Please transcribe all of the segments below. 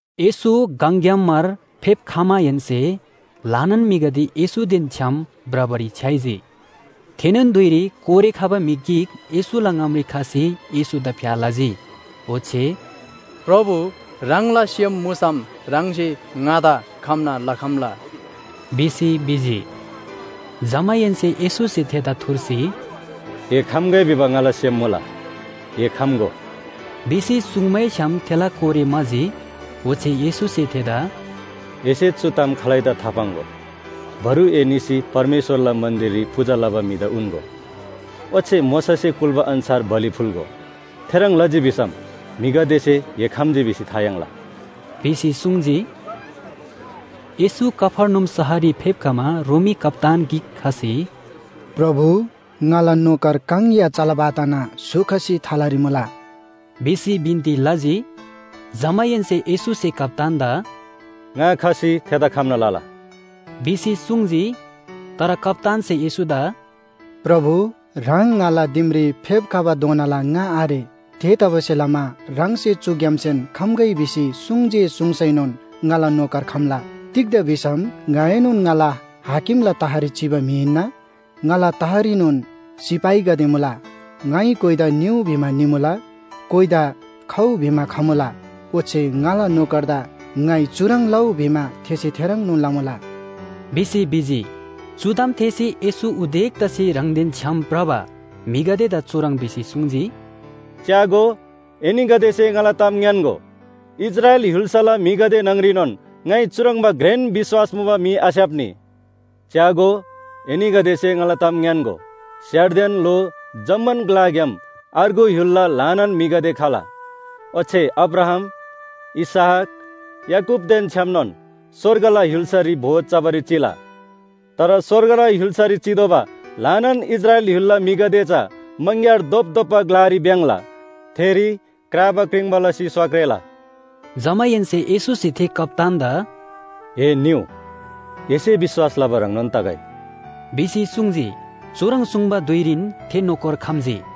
येशू गङग्‍याम मार फेप्‍खमाहेन्‍से ल्‍हानान म्‍हिगदे येशूदेन छ्‌याम भ्रबारी छ्‌याइजी। थेनोन धुइरी कोरे खबा म्‍हि गिक येशूला ङामरी खसी येशूदा फ्‍या लजी। ओच्‍छे “प्रभु, ह्राङला सेम मुसम ह्राङसे ङादा खम्‍ना लखम्‍ला” भिसी भिजी। जमाहेन्‍से येशूसे थेदा थुर्सी “ए खम्‍गै भिबा ङाला सेम मुला, ए खम्‍गो” भिसी सुङ्मैछ्‌याम थेला कोरे म्‍हाजी। ओच्‍छे येशूसे थेदा “एसे चु ताम खालैदा थापाङ्‍गो। बरु ए निसी परमेश्‍वरला मन्‍दिररी पूजा लबा म्‍हिदा उन्‍गो। ओच्‍छे मोशासे कुल्‍बा अन्‍छार बलि फुल्‍गो। थेह्रङ् लजी भिसम म्‍हिगदेसे ए खम्‍जी भिसी था याङ्ला” भिसी सुङ्जी। येशू कफर्नहुम शहररी फेप्‍खमा रोमी कप्‍तान गिक खसी, “प्रभु, ङाला नोकर काङ या चलब आतना स्‍हु खसी थलारी मुला” भिसी बिन्‍ती लजी। जमाहेन्‍से येशूसे कप्‍तानदा “ङा खसी थेदा खम्‍ना लला” भिसी सुङ्जी। तर कप्‍तानसे येशूदा “प्रभु, ह्राङ ङाला दिमरी फेप्‍खबाधोनाला ङा आरे। थेतबासेलमा ह्राङसे चुग्‍यामसेन खम्‍गै भिसी सुङ्जे सुङ्सैनोन ङाला नोकर खम्‍ला। तिग्‍दा भिसम ङाएनोन ङाला हाकिमला तहरी चिबा म्‍हि हिन्‍ना। ङाला तहरीनोन सिपाहीगदे मुला। ङाइ कोइदा निउ भिमा निमुला, कोइदा खउ भिमा खमुला। ओच्‍छे ङाला नोकरदा ङाइ चुह्रङ् लउ भिमा थेसे थेह्रङ्नोन लमुला” भिसी भिजी। चु ताम थेःसी येशू उदेक तसी ह्राङदेन छ्‌याम भ्रबा म्‍हिगदेदा चुह्रङ् भिसी सुङ्जी, “च्‍यागो, एनीगदेसे ङाला ताम ङ्‌यान्‍गो, इस्राएल य्‍हुल्‍साला म्‍हिगदे न्‍हङरीनोन ङाइ चुह्रङ्बा घ्रेन विश्‍वास मुबा म्‍हि आस्‍याप्‍नी। च्‍यागो, एनीगदेसे ङाला ताम ङ्‌यान्‍गो, स्‍यारदेन ल्‍हो जम्‍मान ग्‍लाग्‍याम अर्गु य्‍हुलला ल्‍हानान म्‍हिगदे खला। ओच्‍छे अब्राहाम, इसहाक, याकूबदेन छ्‌यामनोन स्‍वर्गला य्‍हुल्‍सारी भोज चबारी चिला। तर स्‍वर्गला य्‍हुल्‍सारी चितोःबा ल्‍हानान इस्राएल य्‍हुल्‍साला म्‍हिगदे चा मङग्‍यार धोपधोप्‍बा ग्‍लारी भ्‍याङ्‍ला। थेरी क्राबा क्रिङ्बा लसी स्‍वा क्रेला।” जमाहेन्‍से येशूसे थे कप्‍तानदा “ए निउ, एसे विश्‍वास लबा ह्रङ्नोन तगै” भिसी सुङ्जी। चुह्रङ् सुङ्बा धुइरीन थे नोकर खम्‍जी।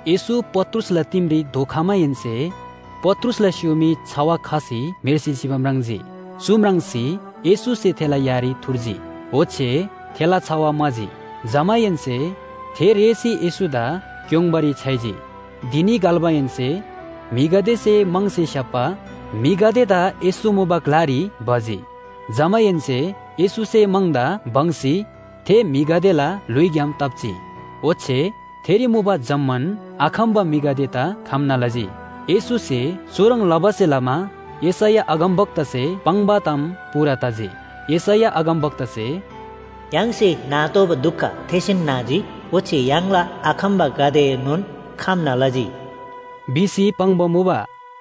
येशू पत्रुसला दिमरी धोखमाहेन्‍से पत्रुसला स्‍युमी छवा खसी म्‍हेर्सी चिबा म्राङ्जी। चु म्राङ्सी येशूसे थेला यारी थुर्जी, ओच्‍छे थेला छवा म्‍हाजी। जमाहेन्‍से थे रेःसी येशूदा क्‍योङ्बारी छ्‌याइजी। धिनी घल्‍माहेन्‍से म्‍हिगदेसे म्‍हङसे स्‍याप्‍बा म्‍हिगदेदा येशू मुबा ग्‍लारी भजी। जमाहेन्‍से येशूसे म्‍हङदा बङ्‌सी थे म्‍हिगदेला ल्‍हुइग्‍याम ताप्‍जी। ओच्‍छे थेरी मुबा जम्‍मान आखम्‍बा म्‍हिगदेदा खम्‍ना लजी। येशूसे चुह्रङ् लबासे लमा यशैया अगमवक्तासे पाङ्बा ताम पूरा तजी। यशैया अगमवक्तासे, “य्‍हाङसे नातोःबा दुख थेसेन नाजी ओच्‍छे य्‍हाङला आखम्‍बागदेएनोन खम्‍ना लजी” भिसी पाङ्बा मुबा।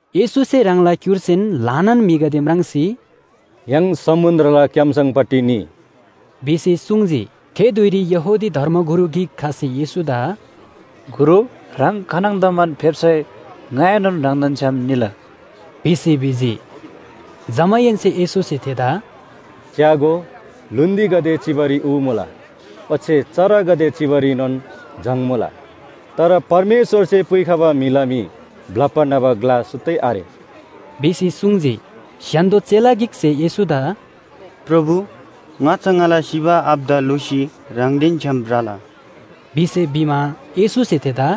येशूसे ह्राङला क्‍युर्सीन ल्‍हानान म्‍हिगदे म्राङ्सी “य्‍हाङ समुन्‍द्रला क्‍याम्‍सङपट्टि निइ” भिसी सुङ्जी। थे धुइरी यहूदी धर्मगुरु गिक खसी येशूदा “गुरु, ह्राङ खानङदमान फेप्‍सै ङाएनोन ह्राङदेन छ्‌याम निला” भिसी भिजी। जमाहेन्‍से येशूसे थेदा “च्‍यागो, ल्‍हुन्‍दीगदे चिबारी ऊ मुला, ओच्‍छे चरागदे चिबारीनोन जङ मुला। तर परमेश्‍वरसे पुइखबा म्‍हिला मी ब्‍लप्‍बा न्‍हबा ग्‍ला सुत्तै आरे” भिसी सुङ्जी। स्‍य्‍हान्‍दो चेला गिकसे येशूदा “प्रभु, ङाच्‍छा ङाला सिबा आबादा ल्‍हुसी ह्राङदेन छ्‌याम भ्रला” भिसी भिमा, येशूसे थेदा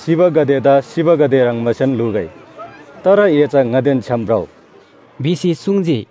“सिबागदेदा सिबागदे ह्रङ्बासेन ल्‍हुगै, तर ए चा ङादेन छ्‌याम भ्रउ” भिसी सुङ्जी।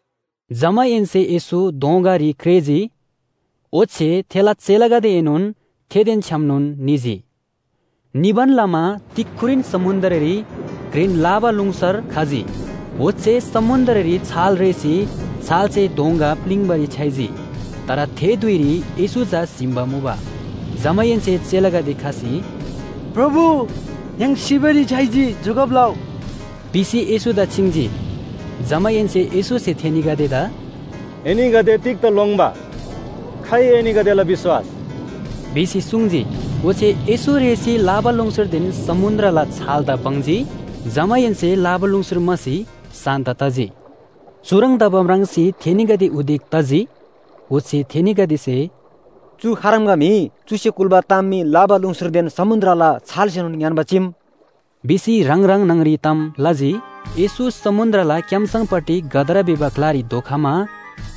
जमाहेन्‍से येशू दोँगारी क्रेःजी, ओच्‍छे थेला चेलागदेएनोन थेदेन छ्‌यामनोन निजी। निबान लमा तिक्‍खुरीन समुन्‍द्ररी घ्रेन लाबालुङसर खजी। ओच्‍छे समुन्‍द्ररी छाल रेःसी छालसे दोँगा प्‍लिङ्‍बारी छ्‌याइजी। तर थे धुइरी येशू चा स्‍हिम्‍बा मुबा। जमाहेन्‍से चेलागदे खसी “प्रभु, य्‍हाङ सिबारी छ्‌याइजी, जोगब लउ” भिसी येशूदा छिङ्जी। जमाहेन्‍से येशूसे थेनीगदेदा “एनीगदे तिग्‍दा लोङ्‌बा? खाइ एनीगदेला विश्‍वास?” भिसी सुङ्जी। ओच्‍छे येशू रेःसी लाबालुङसरदेन समुन्‍द्रला छालदा बङ्जी। जमाहेन्‍से लाबालुङसर म्‍हासी शान्‍त तजी। चुह्रङ् तबा म्राङ्सी थेनीगदे उदेक तजी। ओच्‍छे थेनीगदेसे “चु खाह्रङ्बा म्‍हि? चुसे कुल्‍बा ताम मी लाबालुङसरदेन समुन्‍द्रला छालसेनोन ङ्‌यान्‍बा चीम” भिसी ह्राङ ह्राङ न्‍हङरी ताम लजी। येशू समुन्‍द्रला क्‍याम्‍सङपट्टि गदरा भिबा ग्‍लारी धोखमा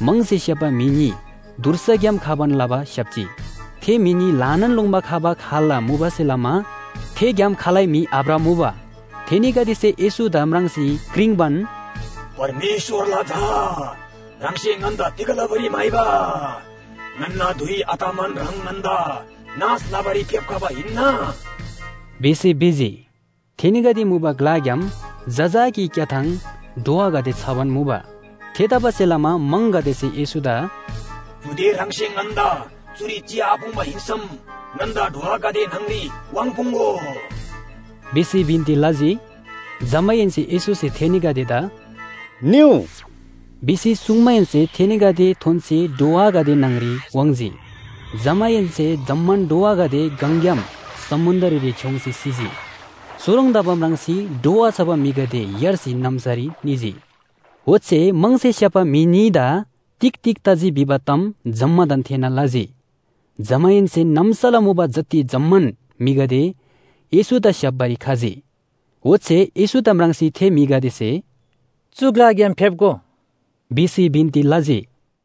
म्‍हङसे स्‍याप्‍बा म्‍हि न्‍ही धुर्साग्‍याम खबान लबा स्‍याप्‍जी। थे म्‍हि न्‍ही ल्‍हानान लोङ्‌बा खबा खाल्‍ला मुबासे लमा थे ग्‍याम खालै म्‍हि आभ्रमुबा। थेनीगदेसे येशूदा म्राङ्सी क्रिङ्बान, “परमेश्‍वरला झा, ह्राङसे ङन्‍दा तिग लबारी म्‍हाइबा? ङन्‍ना धुइ आतमान ह्राङ ङन्‍दा नाश लबारी फेप्‍खबा हिन्‍ना?” भिसी भिजी। थेनीगदे मुबा ग्‍लाग्‍याम जजाकी क्‍याथाङ ढ्वागदे छबान मुबा। थेतबासेलमा म्‍हङगदेसे येशूदा “चुदे ह्राङसे ङन्‍दा चुरी चिआपुङ्बा हिन्‍सम ङन्‍दा ढ्वागदे न्‍हङरी वाङ्पुङ्‍गो” भिसी बिन्‍ती लजी। जमाहेन्‍से येशूसे थेनीगदेदा “निउ” भिसी सुङ्माहेन्‍से थेनीगदे थोन्‍सी ढ्वागदे न्‍हङरी वाङ्‌जी। जमाहेन्‍से जम्‍मान ढ्वागदे गङग्‍याम समुन्‍द्ररी छ्‌योङ्सी सिजी। चुह्रङ् तबा म्राङ्सी ढ्वा छबा म्‍हिगदे यार्सी नाम्‍सारी निजी। ओच्‍छे म्‍हङसे स्‍याप्‍बा म्‍हि न्‍हीदा तिग तिग तजी भिबा ताम जम्‍मादान थेःना लजी। जमाहेन्‍से नाम्‍साला मुबा जति जम्‍मान म्‍हिगदे येशूदा स्‍याप्‍बारी खजी। ओच्‍छे येशूदा म्राङ्सी थे म्‍हिगदेसे “चु ग्‍लाग्‍याम फेप्‍गो” भिसी बिन्‍ती लजी।